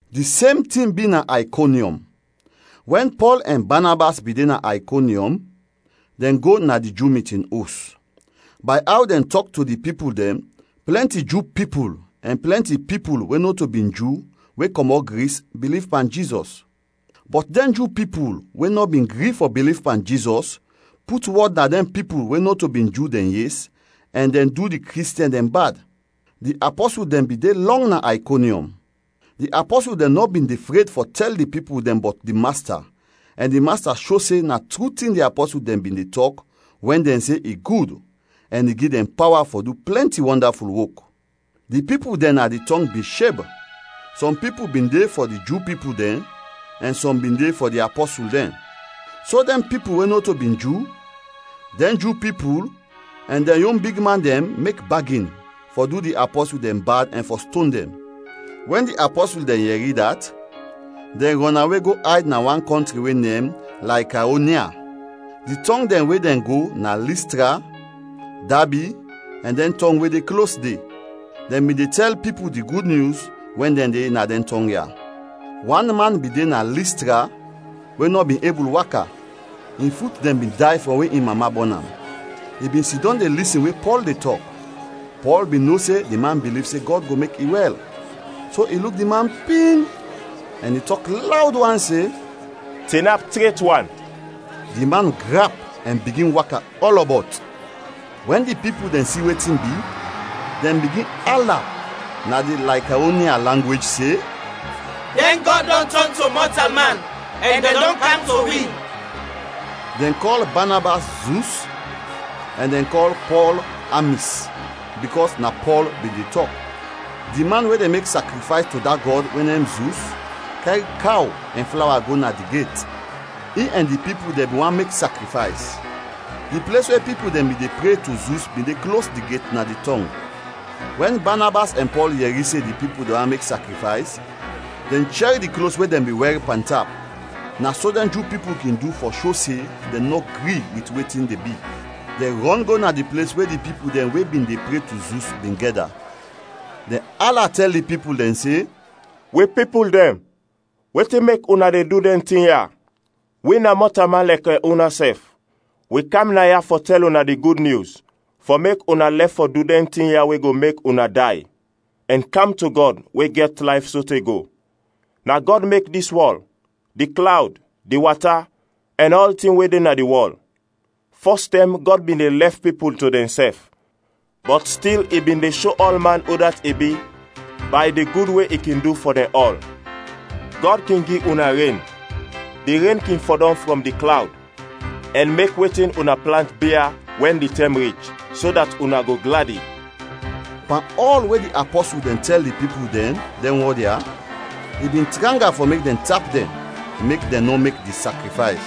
Di sem tin bi na Aykonyɔm. Wɛn Pɔl ɛn Banabas bin de na Aykonyɔm, dɛn go na di Ju mitin os; bay aw dɛn tɔk to di pipul dɛn plɛnti Ju pipul ɛn plɛnti pipul we nɔto bin Ju we kɔmɔt Gris, biliv pan Jizɔs. Bɔt dɛn Ju pipul we nɔ bin gri fɔ biliv pan Jizɔs put wɔd na dɛn pipul we nɔto bin Ju dɛn yes ɛn dɛn du di Kristiɛn dɛn bad. Di apɔsul dɛn bin de lɔng na Aykonyɔm. Di apɔsul dɛn nɔ bin de fred fɔ tɛl di pipul dɛn bɔt di Masta ɛn di Masta sho se na tru tin di apɔsul dɛn bin de tɔk wɛn dɛn se i gud, ɛn i gi dɛn pawa fɔ du plɛnti wɔndaful wok. Di pipul dɛn na di tɔng bin sheb; sɔm pipul bin de fɔ di Ju pipul dɛn ɛn sɔm bin de fɔ di apɔsul dɛn. So dɛn pipul we nɔto bin Ju, dɛn Ju pipul, ɛn dɛn yon bigman dɛn mek bagin fɔ du di apɔsul dɛn bad ɛn fɔ ston dɛn. Wɛn di apɔsul dɛn yɛri dat, dɛn rɔnawe go ayd na wan kɔntri we nem Laykaonia. Di tɔng dɛn we dɛn go na Listra, Dabi, ɛn dɛn tɔng we de klos de. Dɛn bin de tɛl pipul di Gud Nyus wɛn dɛn de na dɛn tɔng ya. Wan man bin de na Listra we nɔ bin ebul waka. In fut dɛn bin day frɔm we in mama bɔn am. I bin sidɔm de lisin we Pɔl de tɔk. Pɔl bin no se di man biliv se Gɔd go mek i wɛl, so i luk di man ping, ɛn i tɔk lawd wan se, “Tinap tret wan!” Di man grap ɛn bigin waka ɔlɔbɔt. Wɛn di pipul dɛn si wetin bi, dɛn bigin ala na di Laykaonia langwej se, “Dɛn gɔd dɔn tɔn to mɔtalman ɛn dɛn dɔn kam to wi!” Dɛn kɔl Banabas “Zus” ɛn dɛn kɔl Pɔl “Amis” bikɔs na Pɔl bin de tɔk. Di man we de mek sakrifays to da gɔd we nem Zus kɛr kaw ɛn flawa go na di get. In ɛn di pipul dɛn bin want mek sakrifays. Di ples we pipul dɛn bin de pre to Zus bin de klos di get na di tɔng. Wɛn Banabas ɛn Pɔl yɛri se di pipul dɛn want mek sakrifays, dɛn chɛr di klos we dɛn bin wɛr pantap. (Na so dɛn Ju pipul kin du fɔ sho se dɛn nɔ gri wit wetin de bi.) Dɛn rɔn go na di ples we di pipul dɛn we bin de pre to Zus bin gɛda. Dɛn ala tɛl di pipul dɛn se, “Wi pipul dɛn, wetin mek una de du dɛn tin ya? Wi na mɔtalman lɛkɛ unasɛf! Wi kam naya fɔ tɛl una di Gud Nyus fɔ mek una lɛf fɔ du dɛn tin ya we go mek una day, ɛn kam to Gɔd we gɛt layf sote go. Na Gɔd mek dis wɔl, di klawd, di wata, ɛn ɔltin we de na di wɔl. Fɔs tɛm Gɔd bin de lɛf pipul to dɛnsɛf. Bɔt stil i bin de sho ɔlman udat i bi bay di gud we i kin du fɔ dɛn ɔl. Gɔd kin gi una ren. Di ren kin fɔdɔm frɔm di klawd, ɛn mek wetin una plant bia wɛn di tɛm rich, so dat una go gladi.” Pan ɔl we di apɔsul dɛn tɛl di pipul dɛn, dɛn wɔd ya, i bin tranga fɔ mek dɛn tap dɛn, mek dɛn nɔ mek di sakrifays.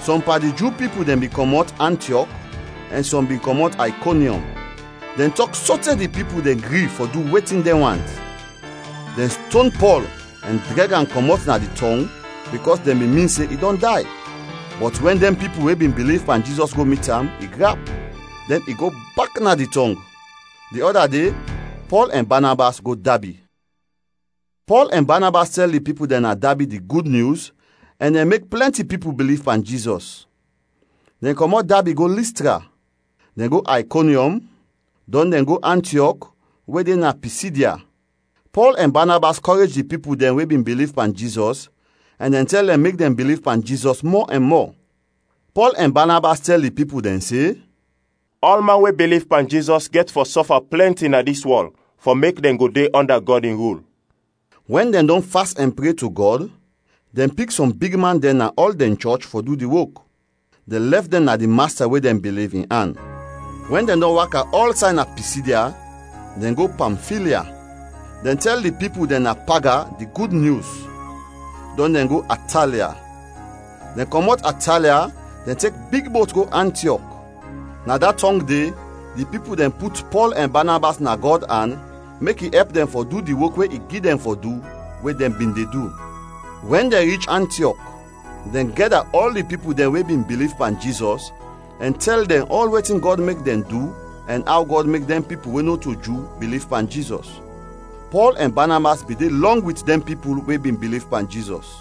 Sɔm pan di Ju pipul dɛn bin kɔmɔt Antiɔk ɛn sɔm bin kɔmɔt Aykonyɔm. Dɛn tɔk sote di pipul dɛn gri fɔ du wetin dɛn want. Dɛn ston Pɔl ɛn drɛg am kɔmɔt na di tɔng bikɔs dɛn bin min se i dɔn day. Bɔt wɛn dɛn pipul we bin biliv pan Jizɔs go mit am, i grap, dɛn i go bak na di tɔng. Di ɔda de Pɔl ɛn Banabas go Dabi. Pɔl ɛn Banabas tɛl di pipul dɛn na Dabi di Gud Nyus ɛn dɛn mek plɛnti pipul biliv pan Jizɔs. Dɛn kɔmɔt Dabi go Listra, dɛn go Aykonyɔm, dɔn dɛn go Antiɔk we de na Pisidya. Pɔl ɛn Banabas kɔrej di pipul dɛn we bin biliv pan Jizɔs ɛn dɛn tɛl dɛn mek dɛn biliv pan Jizɔs mɔ ɛn mɔ. Pɔl ɛn Banabas tɛl di pipul dɛn se, “Ɔlman we biliv pan Jizɔs gɛt fɔ sɔfa plɛnti na dis wɔl fɔ mek dɛn go de ɔnda Gɔd in rul.” Wɛn dɛn dɔn fas ɛn pre to Gɔd, dɛn pik sɔm bigman dɛn na ɔl dɛn chɔch fɔ du di wok, dɛn lɛf dɛn na di Masta, we dɛn biliv, in an. Wɛn dɛn dɔn waka ɔlsay na Pisidya, dɛn go Pamfilya. Dɛn tɛl di pipul dɛn na Paga di Gud Nyus, dɔn dɛn go Atalia. Dɛn kɔmɔt Atalia, dɛn tek big bot go Antiɔk, na da tɔng de, di pipul dɛn put Pɔl ɛn Banabas na Gɔd an mek i ɛp dɛn fɔ du di wok we i gi dɛn fɔ du, we dɛn bin de du. Wɛn dɛn rich Antiɔk, dɛn gɛda ɔl di pipul dɛn we bin biliv pan Jizɔs ɛn tɛl dɛn ɔl wetin Gɔd mek dɛn du ɛn aw Gɔd mek dɛn pipul we nɔto Ju biliv pan Jizɔs. Pɔl ɛn Banabas bin de lɔng wit dɛn pipul we bin biliv pan Jizɔs.